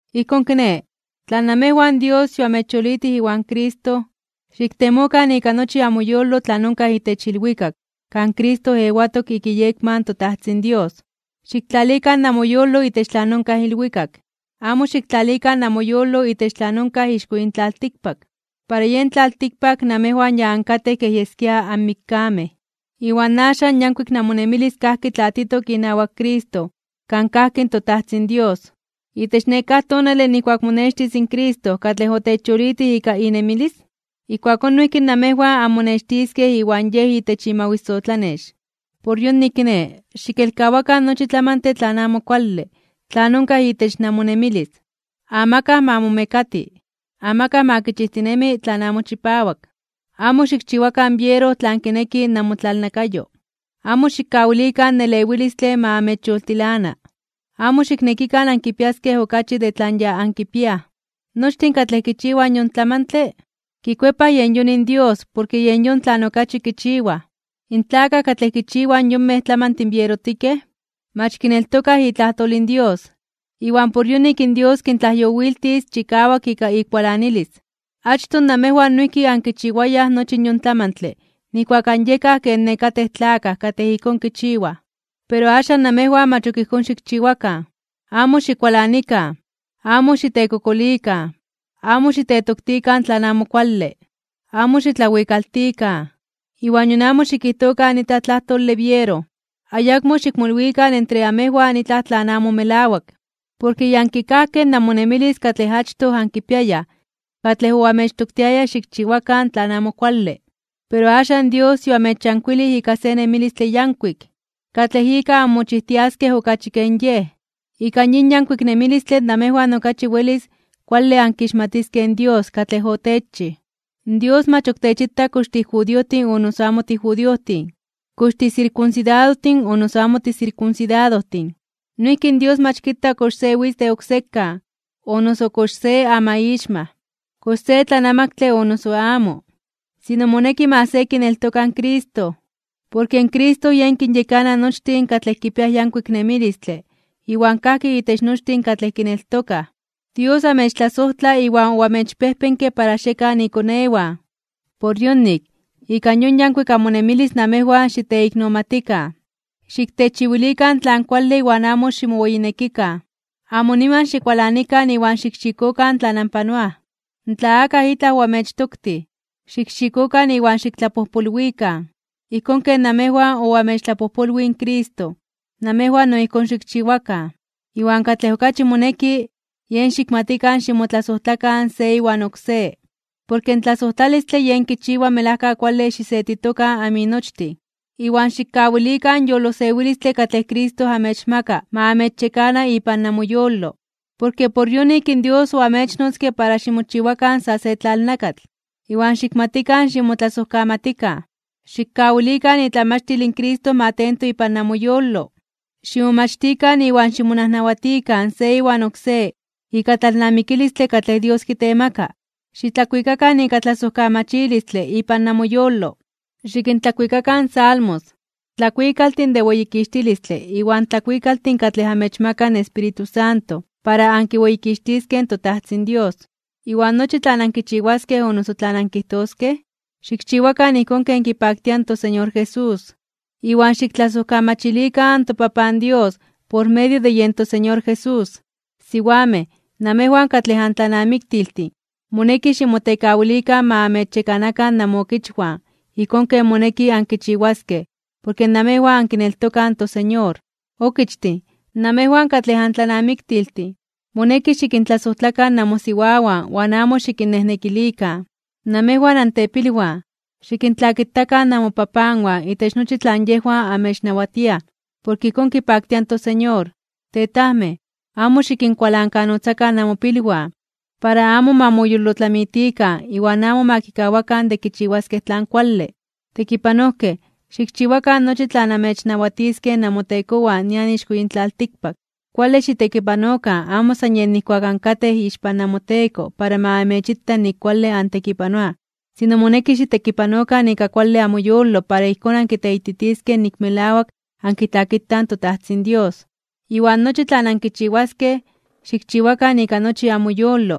Ijkón kiné, tla namejwan Dios yoamechyolitij iwan Cristo, xiktemokan ika nochi amoyolo tlan onkaj itech ilwikak kan Cristo ewatok ik iyekma in toTajtzin Dios. Xiktlalikan namoyolo itech tlan onkaj ilwikak, amo xiktlalikan namoyolo itech tlan onkaj ixko yin tlaltikpak. Para yen tlaltikpak namejwan ya ankatej kej yeskia anmikkamej, iwan axan in yankuik namonemilis kajki tlatitok inawak Cristo kan kajki in toTajtzin Dios. Itech nekáj tonale nijkuak monextis in Cristo katlej otechyolitij ika inemilis, ijkuakón noijki namejwan anmonextiskej iwan Yej itech imawisotlanex. Por yonik kiné, xikelkawakan nochi tlamantle tlan amo kuale tlan onkaj itech namonemilis. Amakaj ma momekati, amakaj ma kichijtinemi tlan amo chipawak, amo xikchiwakan biero tlan kineki namotlalnakayo, amo xikkawilikan in elewilistle ma amechyoltilana, amo xiknekikan ankipiaskej okachi de tlan ya ankipiaj. Nochtin katlej kichiwaj yon tlamantle, kikuepaj yen yon indios porke yen yon tlan okachi kichiwaj. In tlakaj katlej kichiwaj in yonmej tlamantin bierotikej, mach kineltokaj itlajtol in Dios, iwan por yonik in Dios kintlajyowiltis chikawak ika ikualanilis. Achtoj namejwan noijki ankinchiwayaj nochi yon tlamantle nijkuak anyekaj ken nekatej tlakaj katlej ijkón kichiwaj. Pero axan namejwan mach ok ijkón xikchiwakan. Amo xikualanikan, amo xitekokolikan, amo xitetoktikan tlan amo kuale, amo xitlawikaltikan, iwan nion amo xikijtokan itlaj tlajtole biero. Ayakmo xikmolwikan entre amejwan itlaj tlan amo melawak. Porke ya ankikajkej namonemilis katlej achtoj ankipiayaj katlej oamechtoktiaya xikchiwakan tlan amo kuale. Pero axan Dios yoamechyankuilij ika se nemilistle yankuik, katlej ika anmochijtiaskej okachi ken Yej. Ika yin yankuik nemilistle namejwan okachi welis kuale ankixmatiskej in Dios katlej otechchij. Dios mach ok techita kox tijudiojtin o noso amo tijudiojtin, kox tisirkunsidadojtin o noso amo tisirkunsidadojtin. Noijki in Dios mach kita kox se witz de oksekan, o noso kox se amaixmaj, kox se tlanamaktle o noso amo. Sino moneki ma se kineltoka in Cristo, porke Cristo yen kinyekana nochtin katlej kipiaj yankuik nemilistle iwan kajki itech nochtin katlej kineltokaj. Dios amechtlasojtla iwan oamechpejpenke para xiekan ikonewan. Por yonik, ika yon yankuik amonemilis namejwan xiteiknomatikan. Xiktechiwilikan tlan kuale iwan amo ximoweyinekikan. Amo niman xikualanikan iwan xikxikokan tlan anpanoaj. Tla akaj itlaj oamechtoktij, xikxikokan iwan xiktlapojpolwikan, ijkón ken namejwan oamechtlapojpolwij in Cristo, namejwan no ijkón xikchiwakan. Iwan katlej okachi moneki, yen xikmatikan ximotlasojtlakan se iwan oksé, porke in tlasojtlalistle yen kichiwa melajka kuale xisetitokan aminochtin. Iwan xikkawilikan in yolosewilistle katlej Cristo amechmaka ma amechyekana ipan namoyolo, porke por yonik in Dios oamechnotzke para ximochiwakan sa se tlalnakatl. Iwan xikmatikan ximotlasojkamatikan. Xikkawilikan itlamachtil in Cristo ma tento ipan namoyolo. Ximomachtikan iwan ximonajnawatikan se iwan oksé ika tlalnamikilistle katlej Dios kitemaka. Xitlakuikakan ika tlasojkamachilistle ipan namoyolo. Xikintlakuikakan salmos, tlakuikaltin de weyikixtilistle iwan tlakuikaltin katlej amechmaka in Espíritu Santo para ankiweyikixtiskej in toTajtzin Dios. Iwan nochi tlan ankichiwaskej o noso tlan ankijtoskej, xikchiwakan ijkón ken kipaktia in toSeñor Jesús. Iwan xiktlasojkamachilikan in toPapan Dios por medio de yen toSeñor Jesús. Siwamej, namejwan katlej antlanamiktiltin, moneki ximotekawilikan ma amechyekanakan namookichwan ijkón ken moneki ankichiwaskej porke namejwan ankineltokaj in toSeñor. Okichtin, namejwan katlej antlanamiktiltin, moneki xikintlasojtlakan namosiwawan iwan amo xikinnejnekilikan (xikinmaltratarokan). Namejwan antepilwan, xikintlakitakan namopapanwan itech nochi tlan yejwan amechnawatiaj, porke ijkón kipaktia in toSeñor. Tetajmej, amo xikinkualankanotzakan namopilwan, para amo ma moyolotlamitikan iwan amo ma kikawakan de kichiwaskej tlan kuale. Tekipanojkej, xikchiwakan nochi tlan amechnawatiskej namotekowan nian ixko yin tlaltikpak. Kuale xitekipanokan amo san yej nijkuak ankatej ixpan namoteko para ma amechita nik kuale antekipanoaj. Sino moneki xitekipanokan ika kuale amoyolo para ijkón ankiteititiskej nik melawak ankitlakitaj in toTajtzin Dios. Iwan nochi tlan ankichiwaskej, xikchiwakan ika nochi amoyolo,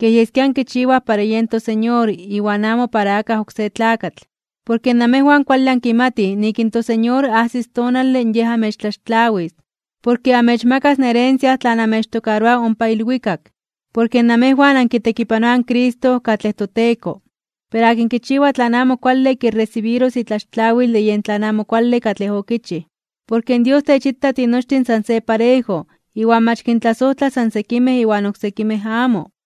kej yeskia ankichiwaj para yen toSeñor iwan amo para akaj oksé tlakatl. Porke namejwan kuale ankimatij nik in toSeñor ajsis tonale Yej amechtlaxtlawis, porke amechmakas in herencia tlan amechtokaroa ompa ilwikak. Porke namejwan ankitekipanoaj in Cristo katlej toTeko. Pero akin kichiwa tlan amo kuale kiresibiros itlaxtlawil de yen tlan amo kuale katlej okichij, porke Dios techita tinochtin san se parejo iwan mach kintlasojtla san sekimej iwan oksekimej amo.